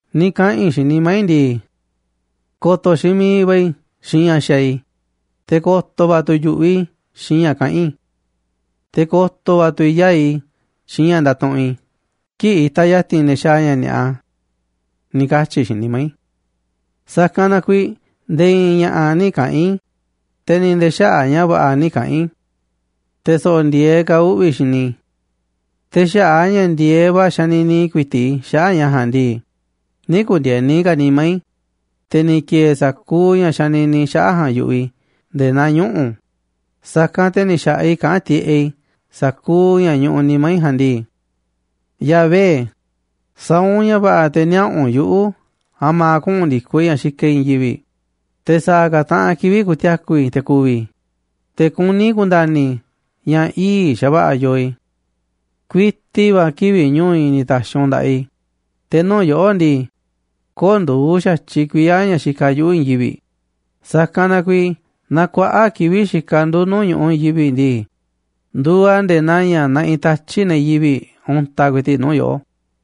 Ni̱ kaꞌa̱n i̱ xiinꞌ nimá i̱ ndii: “Ko̱to̱ xiinꞌ miiꞌ va̱ i̱ xiinꞌ ña̱ xaaꞌ i̱, te̱ ko̱to̱ va̱ tu̱ i̱ yu̱ꞌuꞌ i̱ xiinꞌ ña̱ kaꞌán i̱. Te̱ ko̱to̱ va̱ tu̱ i̱ yaa̱ꞌ i̱ xiinꞌ ña̱ ndatuꞌunꞌ i̱ kii̱ꞌ itaꞌ ya̱ti̱n ne̱ xaaꞌ ña̱ ni̱a̱ꞌa”, ni̱ katyi̱ i̱ xiinꞌ nimá i̱. Sa̱kanꞌ na kuiiꞌ nde̱e̱ i̱i̱n ña̱ꞌa̱ nï̱ kaꞌa̱n i̱, te̱ ni̱ nde̱e̱ xaꞌa̱ꞌ ña̱ va̱ꞌa̱ nï̱ kaꞌa̱n i̱. Te̱ so̱ꞌo̱ ndi̱e̱eꞌ ka̱ uꞌvi̱ xini i̱. Te̱ xaꞌa̱ꞌ a̱ ña̱ ndi̱e̱eꞌ va̱ xanini ku̱i̱ti̱ꞌ i̱ xaꞌa̱ꞌ ña̱ ja̱a̱nꞌ ndii, nï̱ ku̱ndi̱e̱ni ka̱ nimá i̱, te̱ ni̱ ki̱e̱e̱ sa̱kuuꞌ ña̱ xanini i̱ xaꞌa̱ꞌ ja̱a̱nꞌ yu̱ꞌuꞌ i̱ nde̱e̱ naa ñuꞌu̱, sa̱kanꞌ te̱ ni̱ xa̱ꞌaꞌ i̱ kaꞌán tiꞌeꞌ i̱ sa̱kuuꞌ ña̱ ñuꞌuꞌ nimá i̱ ja̱a̱nꞌ ndii: “Yahvé, sa̱a̱ u̱nꞌ ña̱ va̱ꞌa̱ te̱ niaꞌa̱ u̱nꞌ yuꞌu̱ a̱ma̱ kuꞌu̱n ndi̱koꞌ i̱ ña̱ xikaꞌ i̱ i̱i̱n yivi̱ꞌ, te̱ sa̱a̱ ka̱ taꞌanꞌ kivi̱ꞌ ku̱ti̱a̱ku̱ i̱ te̱ ku̱vi̱ i̱, te̱ kuní i̱ ku̱nda̱ni̱ i̱ ña̱ ii̱ꞌ xa̱va̱ꞌa̱ yoo i̱. Kuiti va̱ kivi̱ꞌ ñu̱u̱ i̱ ni̱ ta̱xi̱ u̱nꞌ nda̱ꞌaꞌ i̱, te̱ nuu̱ꞌ yoꞌó ndii, köo̱ꞌ nduuꞌ xa̱tyiꞌ kuiya̱ ña̱ xikaꞌ yuꞌu̱ i̱i̱n yivi̱ꞌ, sa̱kanꞌ na kuiiꞌ naaꞌ kuaꞌa̱ꞌ kivi̱ꞌ xikaꞌ ndu̱ nuu̱ꞌ ñu̱ꞌuꞌ i̱i̱n yivi̱ꞌ ndii, nduuꞌ a̱ nde̱e̱ naa ña̱ naꞌiꞌ tatyi̱ꞌ ne̱ yivi̱ꞌ untaꞌ ku̱i̱ti̱ꞌ nuu̱ꞌ yoꞌó.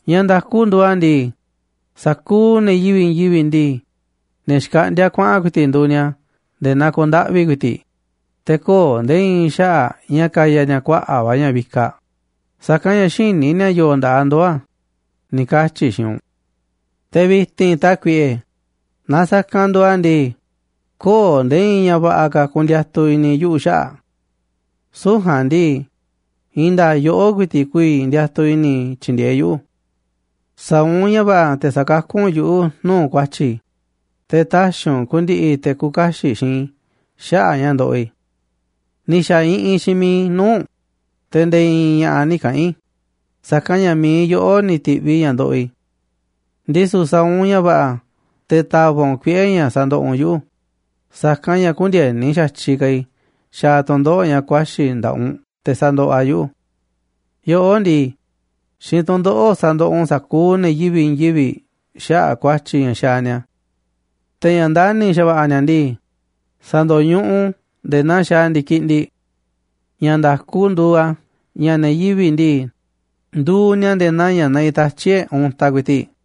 Ña̱ nda̱ku nduuꞌ a̱ ndii, sa̱kuuꞌ ne̱ yivi̱ꞌ i̱i̱n yivi̱ꞌ ndii, ne̱ xkaꞌndíá kuaꞌa̱n ku̱i̱ti̱ꞌ nduuꞌ ni̱a̱ nde̱e̱ naa ku̱ndaꞌvi̱ ku̱i̱ti̱ꞌ, te̱ köo̱ꞌ nde̱e̱ i̱i̱n xaꞌa̱ꞌ ña̱ kaya ni̱a̱ kuaꞌa̱ꞌ va̱ ña̱ vikaꞌ, sa̱kanꞌ ña̱ xïní ni̱a̱ yo̱o̱ nda̱ꞌaꞌ ndoo̱ a̱”, ni̱ katyi̱ i̱ xiinꞌ u̱nꞌ. Te̱ vi̱ti̱n, Tákuiꞌe, naaꞌ sa̱kanꞌ nduuꞌ a̱ ndii, köo̱ꞌ nde̱e̱ i̱i̱n ña̱ va̱ꞌa̱ ka̱ ku̱ndi̱a̱tu̱ i̱ni̱ yuꞌu̱ xaꞌa̱ꞌ. Süu̱ꞌ ja̱a̱nꞌ ndii, i̱i̱n nda̱a̱ꞌ yoꞌó ku̱i̱ti̱ꞌ ku̱vi̱ ndiatuꞌ i̱ni̱ i̱ tyi̱ndi̱e̱eꞌ yuꞌu̱. Sa̱a̱ u̱nꞌ ña̱ va̱ꞌa̱ te̱ sa̱kakú u̱nꞌ yuꞌu̱ nuu̱ꞌ ku̱a̱tyi̱ i̱, te̱ tä̱xi̱ u̱nꞌ ku̱ndi̱ꞌi̱ te̱ küuꞌ kaxiꞌ xiinꞌ i̱ xaꞌa̱ꞌ a̱ ña̱ ndoꞌoꞌ i̱. Ni̱ xa̱ iꞌinꞌ xiinꞌ mi̱iꞌ i̱ nuu̱ꞌ u̱nꞌ, te̱ nde̱e̱ i̱i̱n ña̱ꞌa̱ nï̱ kaꞌa̱n i̱, sa̱kanꞌ ña̱ mi̱iꞌ yoꞌó ni̱ ti̱ꞌviꞌ ña̱ ndoꞌoꞌ i̱. Ndisu̱ sa̱a̱ u̱nꞌ ña̱ va̱ꞌa̱ te̱ ta̱va̱ꞌ u̱nꞌ kuiꞌe̱ ña̱ sa̱ndoꞌoꞌ u̱nꞌ yuꞌu̱, sa̱kanꞌ ña̱ kündieni xa̱tyiꞌ ka̱ i̱ xaaꞌ tu̱ndoꞌo̱ꞌ ña̱ ku̱a̱xi̱ nda̱ꞌaꞌ u̱nꞌ te̱ sandoꞌoꞌ a̱ yuꞌu̱. Yoꞌó ndii, xiinꞌ tu̱ndoꞌo̱ꞌ sa̱ndoꞌoꞌ u̱nꞌ sa̱kuuꞌ ne̱ yivi̱ꞌ i̱i̱n yivi̱ꞌ xaꞌa̱ꞌ ku̱a̱tyi̱ ña̱ xaaꞌ ni̱a̱. Te̱ ña̱ ndani̱ xa̱va̱ꞌa̱ ni̱a̱ ndii, sa̱ndo̱ñuꞌuꞌ u̱nꞌ u̱n nde̱e̱ naa xaaꞌ ndi̱kiꞌndiꞌ. Ña̱ nda̱ku nduuꞌ a̱ ña̱ ne̱ yivi̱ꞌ ndii, nduuꞌ ni̱a̱ nde̱e̱ naa ña̱ naꞌiꞌ tatyi̱ꞌ e̱ꞌ untaꞌ ku̱i̱ti̱ꞌ.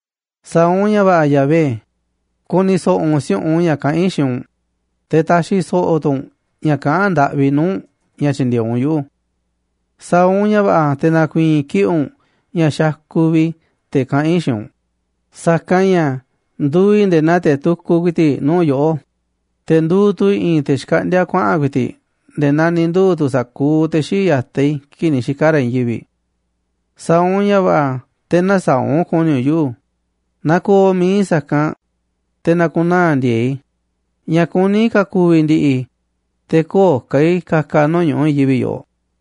Sa̱a̱ u̱nꞌ ña̱ va̱ꞌa̱, Yahvé, ku̱ni̱ so̱ꞌo̱ u̱nꞌ si̱u̱ꞌunꞌ ña̱ kaꞌán i̱ xiinꞌ u̱nꞌ, te̱ ta̱xi̱ so̱ꞌo̱ tu̱ u̱nꞌ ña̱ kaꞌán ndaꞌvi i̱ nuu̱ꞌ u̱nꞌ ña̱ tyi̱ndi̱e̱eꞌ u̱nꞌ yuꞌu̱. Sa̱a̱ u̱nꞌ ña̱ va̱ꞌa̱ te̱ na̱ku̱i̱i̱n kiꞌi̱ꞌ u̱nꞌ ña̱ xakuꞌ vi̱ꞌ i̱ te̱ kaꞌán i̱ xiinꞌ u̱nꞌ, sa̱kanꞌ ña̱ nduuꞌ i̱ nde̱e̱ naa te̱ tukuꞌ ku̱i̱ti̱ꞌ nuu̱ꞌ yoꞌó, te̱ nduuꞌ tu̱ i̱ i̱i̱n te̱ xkaꞌndíá kuaꞌa̱n ku̱i̱ti̱ꞌ nde̱e̱ naa ni̱ nduu̱ tu̱ sa̱kuuꞌ te̱ xii̱ꞌ ya̱taꞌ i̱ kii̱ꞌ ni̱ xika̱ ra̱ i̱i̱n yivi̱ꞌ. Sa̱a̱ u̱nꞌ ña̱ va̱ꞌa̱ te̱ nä̱saa̱ꞌ u̱nꞌ ku̱ni̱ u̱nꞌ yuꞌu̱, na ko̱o̱ mi̱iꞌ i̱ sa̱kanꞌ, te̱ na̱ku̱naa̱ ndi̱e̱e̱ꞌ i̱, ña̱ kuní ka̱ ku̱vi̱ ndi̱ꞌi̱ i̱, te̱ köo̱ꞌ ka̱ i̱ ka̱ka̱ nuu̱ꞌ ñu̱ꞌuꞌ i̱i̱n yivi̱ꞌ yoꞌoꞌ.